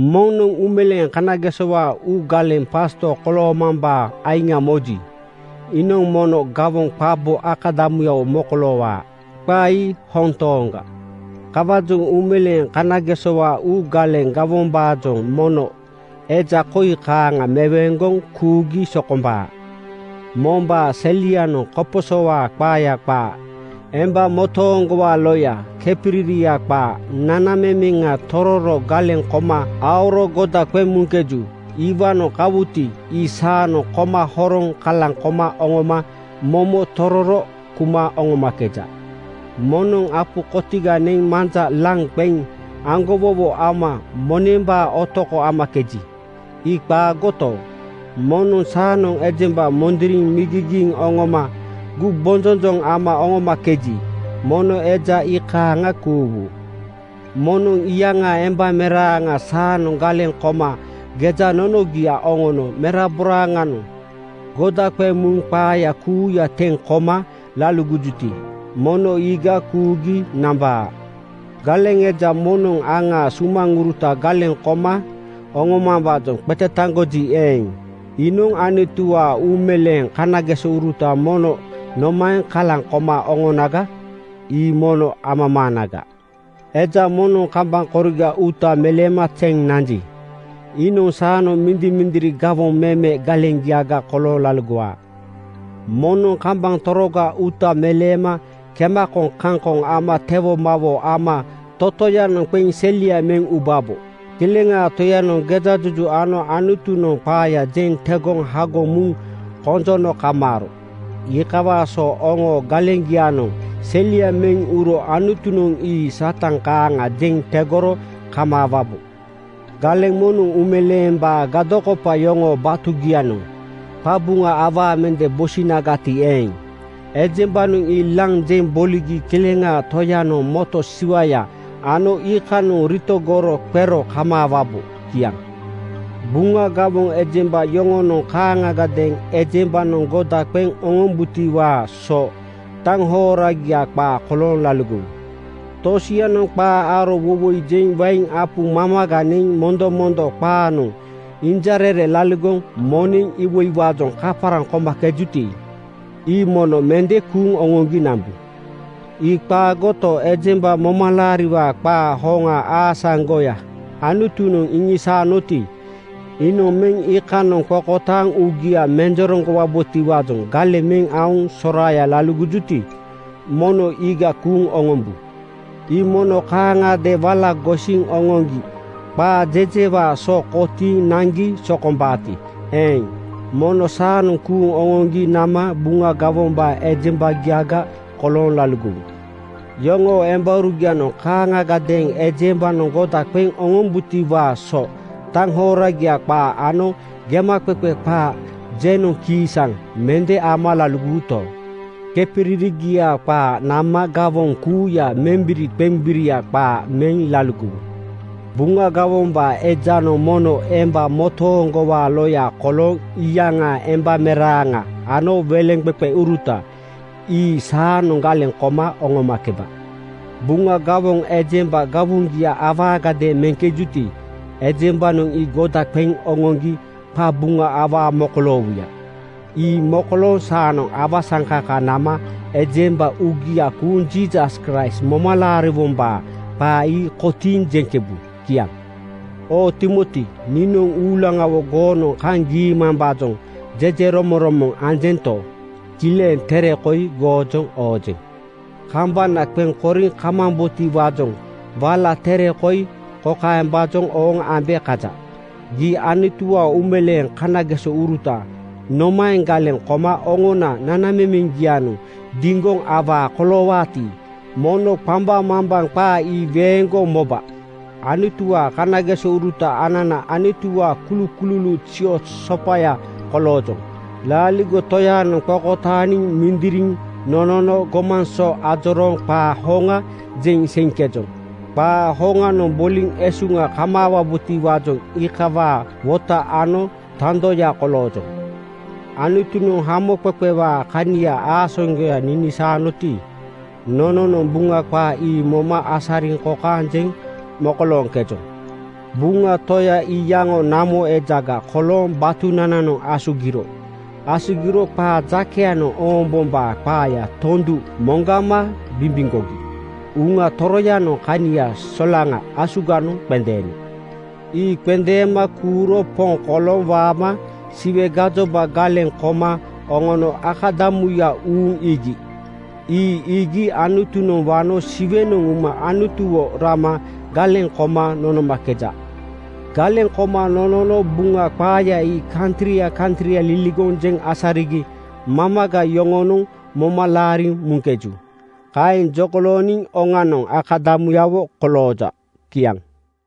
Moŋnoŋ uumeleeŋ kanagesowaa uu galeŋ pasto koloomambaa aiŋ moji, iinoŋ mono gawoŋ qabo akadamuyawo mokoloowaa. Qaa ii hoŋ tooŋaga. Kawaajoŋ uumeleeŋ kanagesowaa uu galeŋ gawombaajoŋ mono eja koi kaaŋa meweeŋgoŋ kuugi sokombaa: Mombaa selianoŋ koposowaa qaaya qaa, emba motooŋgowaa loya, kepiriria qaa, nanamemeŋa tororo galeŋ koma aoro goda qeŋ muŋkeju. Iwaanoŋ kawuti, ii saanoŋ koma horoŋ kalaŋ koma oŋoma momo tororo kuma oŋomakeja. Moŋnoŋ apu kotiga neŋ manja laŋ qeŋ aŋgowowo ama monembaa otoko amakeji, ii qaagoto, moŋnoŋ saanoŋ ejemba mondoriŋ migigiiŋ oŋoma gumbonjonjoŋ ama oŋomakeji, mono eja iikaaŋa kuuwu. Moŋnoŋ iyaŋaa embameraaŋa saanoŋ galeŋ koma gejanonogia oŋono meraboraaŋanoŋ goda qeŋ muŋ qaaya kuuya teŋ koma laligojuti, mono iiga kuugi nambaa. Galeŋ eja moŋnoŋ aŋaa sumaŋuruta galeŋ koma oŋomambaajoŋ qetetaŋgoji eeŋ, iinoŋ Anutuwaa uumeleeŋ kanagesouruta mono nomaeŋ kalaŋ koma oŋonaga? Ii mono amamaanaga. Eja moŋnoŋ kambaŋ koriga uuta meleema zeŋ nanji, iinoŋ saanoŋ mindimindiri gawoŋ meme galeŋgiaga kolooŋ laligowaa. Moŋnoŋ kambaŋ toroga uuta meleema kemakoŋ kaŋkoŋ ama tewomawoo ama totoyanoŋ qeŋ selia meŋ ubabo. Kileŋaa Toyanoŋ gejajuju ano Anutunoŋ qaaya jeŋ tegoŋ hagoŋ muŋ konjono kamaaro. Iikawaa so oŋoo galeŋgianoŋ selia meŋ uro Anutunoŋ ii Satan kaaŋa jeŋ tegoro kamaawabo. Galeŋ moŋnoŋ uumeleembaa gadokopa yoŋoo batugianoŋ qabuŋa awaa mende bosinagati eeŋ, ejembanoŋ ii laŋ jeŋ boligi Kileŋaa Toyanoŋ moto siwaya ano iikanoŋ ritogoro qero kamaawabo. Kiaŋ. Buŋa gawoŋ ejemba yoŋonoŋ kaaŋagadeeŋ ejembanoŋ goda qeŋ oŋombutiwaa so taŋhoragia qaa kolooŋ laligowu. Tosianoŋ qaa aro woiwoi jeŋ wain apu mamaga neŋ mondomondo qaganoŋ injarere laligoŋ moneŋ iwoiwaajoŋ kaparaŋ komakejuti, ii mono mende kuuŋ oŋoŋgi nambu. Ii qaagoto, ejemba momalaariwaa qaa hoŋa aasaŋgoya Anutunoŋ iŋisaanoti, iinoŋ meŋ iikanoŋ qokotaaŋ uugia menjereŋgo-wabotiwaajoŋ galeŋ meŋ aoŋ soraaya laligojuti, mono iiga kuuŋ oŋombu. Ii mono kaaŋagadeeŋ wala gosiŋ oŋoŋgi qaa jejeŋiwaa so kotiiŋ naŋgi sokombaati eeŋ, mono saanoŋ kuuŋ oŋoŋgi nama Buŋa gawombaa ejembagiaga kolooŋ laligowu. Yoŋoo embaurugianoŋ kaaŋagadeeŋ ejembanoŋ goda qeŋ oŋombutiwaa so taŋhoragia qaa ano gemaqeqe qaa jenoŋ kiisaŋ mende ama laligowuto, kepiririgia qaa nama gawoŋ kuuya membiriqembirigia qaa meŋ laligowu. Buŋa gawoŋ ejanoŋ mono emba motooŋgowaa loya kolooŋ iyaŋaa embameraaŋa ano weleŋqeqeuruta ii saanoŋ galeŋ koma oŋomakeba. Buŋa gawoŋ ejemba gawoŋgia awaagadeeŋ meŋkejuti, ejembanoŋ ii goda qeŋ oŋoŋgi qabuŋa awaa mokoloowuya. Ii mokolooŋ saanoŋ awasaŋkaka nama ejemba uugia kuuŋ Jiisas Kraist moma laariwombaa qaa ii kotiiŋ jeŋkebu. Kiaŋ. Oo Timoti, niinoŋ uulaŋawo goonoŋ kaŋ giimambaajoŋ jejeromoŋromoŋ anjento, kileŋ tere koi goojoŋ oojeŋ. Kambana qeŋ koriŋ kamambotiwaajoŋ wala tere koi kokaembaajoŋ ooŋ ambe kaja: Gii Anutuwaa uumeleeŋ kanagesouruta nomaeŋ galeŋ koma oŋona nanamemeŋgianoŋ diŋgoŋ awaa koloowaati, mono qambaŋmambaŋ qaa ii weeŋgoŋ moba. Anutuwaa kanagesouruta anana Anutuwaa kulukululuuŋ zioz sopaya koloojoŋ. Laaligo Toyaanoŋ qokotaaniŋ mindiriŋ nonono gomaŋ so ajorooŋ qaa hoŋa jeŋ seiŋkejoŋ. Qaa hoŋanoŋ boliŋ esuŋa kamaawabotiwaajoŋ iikawaa wota ano tandoya koloojoŋ. Anutunoŋ hamoqeqewaa kania aasaŋgoya ninisaanoti, nononoŋ Buŋa qaa ii moma asariŋ kokaeŋ jeŋ mokolooŋkejoŋ: Buŋa Toya iyaŋo namo ejaga kolooŋ batunananoŋ asugiro. Asugiro qaa jakeyanoŋ oombombaa qaaya tondu moŋgama bimbimgogi Uŋa Toroyanoŋ kania solaŋa asuganoŋ qendeeno. Ii qendeema kuuro Poŋ kolooŋ waama Siwe gajoba galeŋ koma oŋono akadamuya uuŋ iigi. Ii iigi Anutunoŋ wano Siwenoŋ uma Anutuwo rama galeŋ koma nonomakeja. Galeŋ koma nonono Buŋa qaaya ii kantria kantria liligoŋ jeŋ asarigi mamaga yoŋonoŋ moma laariŋ muŋkeju. Kaeŋ jokolooniŋ oŋanoŋ akadamuyawo kolooja. Kiaŋ.